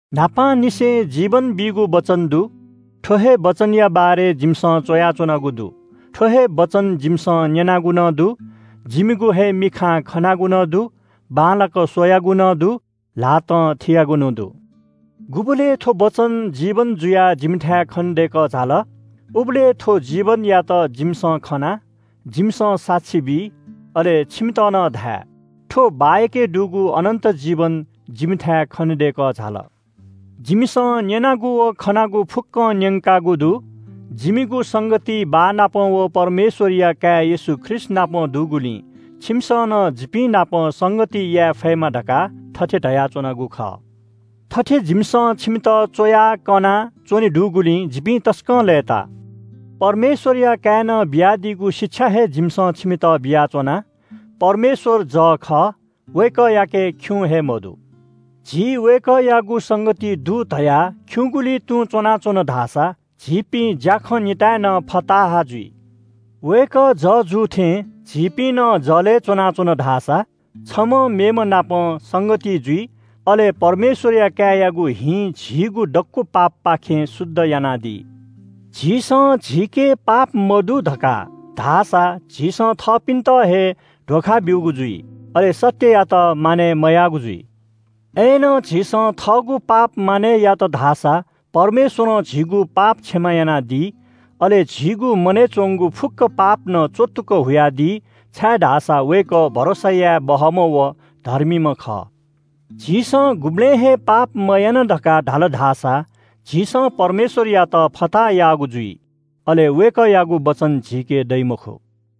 न्‍हापांनिसें जीवन बीगु वचन दु। थ्‍व हे वचनया बारे जिमिसं च्‍वयाच्‍वनागु दु। थ्‍व हे वचन जिमिसं न्‍यनागु नं दु। जिमिगु हे मिखां खनागु नं दु, बांलाक स्‍वयागु नं दु, ल्‍हातं थियागु नं दु। गुबलय् थ्‍व वचन जीवन जुयाः जिमिथाय् खनेदय्‌कः झाल, उबलय् थ्‍व जीवनयात जिमिसं खना, जिमिसं साक्षी बी, अले छिमित नं धाये। थ्‍व बाःयाके दुगु अनन्‍त जीवन जिमिथाय् खनेदय्‌कः झाल। जिमिसं न्‍यनागु व खनागु फुक्‍कं न्‍यंकागु दु। जिमिगु संगति बाः नाप व परमेश्‍वरया काय् येशू ख्रीष्‍टनाप दुगुलिं छिमिसं नं जिपिं नाप संगति याये फयेमा धकाः थथे धयाच्‍वनागु खः। थथे जिमिसं छिमित च्‍वयाः कयाच्‍वने दुगुलिं जिपिं तसकं लय्‌ताः। परमेश्‍वरया काय्‌नं बियादीगु शिक्षा हे जिमिसं छिमित बियाच्‍वना। परमेश्‍वर जः खः। वय्‌कःयाके खिउँ हे मदु। झी वय्‌कःयागु संगतिइ दु धयाः खिउँगुलिइ तुं च्‍वनाच्‍वन धाःसा झीपिं ज्‍याखँ निताय् नं फताहा जुइ। वय्‌कः जः जू थें, झीपिं नं जलय् च्‍वनाच्‍वन धाःसा छम्‍ह मेम्‍हनापं संगतिइ जुइ, अले परमेश्‍वरया काय्‌यागु हिं झीगु दक्‍व पापपाखें शुद्ध यानादी। झीसं “झीके पाप मदु” धकाः धाःसा झीसं थःपिन्‍त हे ध्‍वखा ब्‍यूगु जुइ, अले सत्‍ययात मानय् मयाःगु जुइ। अय्‌नं झीसं थःगु पाप मानय् यात धाःसा परमेश्‍वरं झीगु पाप क्षमा यानादी, अले झीगु मनय् च्‍वंगु फुक्‍क पाप नं च्‍वत्तुक हुयादी, छाय्‌धाःसा वय्‌कः भरोसा याये बहःम्‍ह व धर्मीम्‍ह खः। “झीसं गुबलें हे पाप मयाना” धकाः धाल धाःसा झीसं परमेश्‍वरयात फताहा याःगु जुइ। अले वय्‌कःयागु वचन झीके दइ मखु।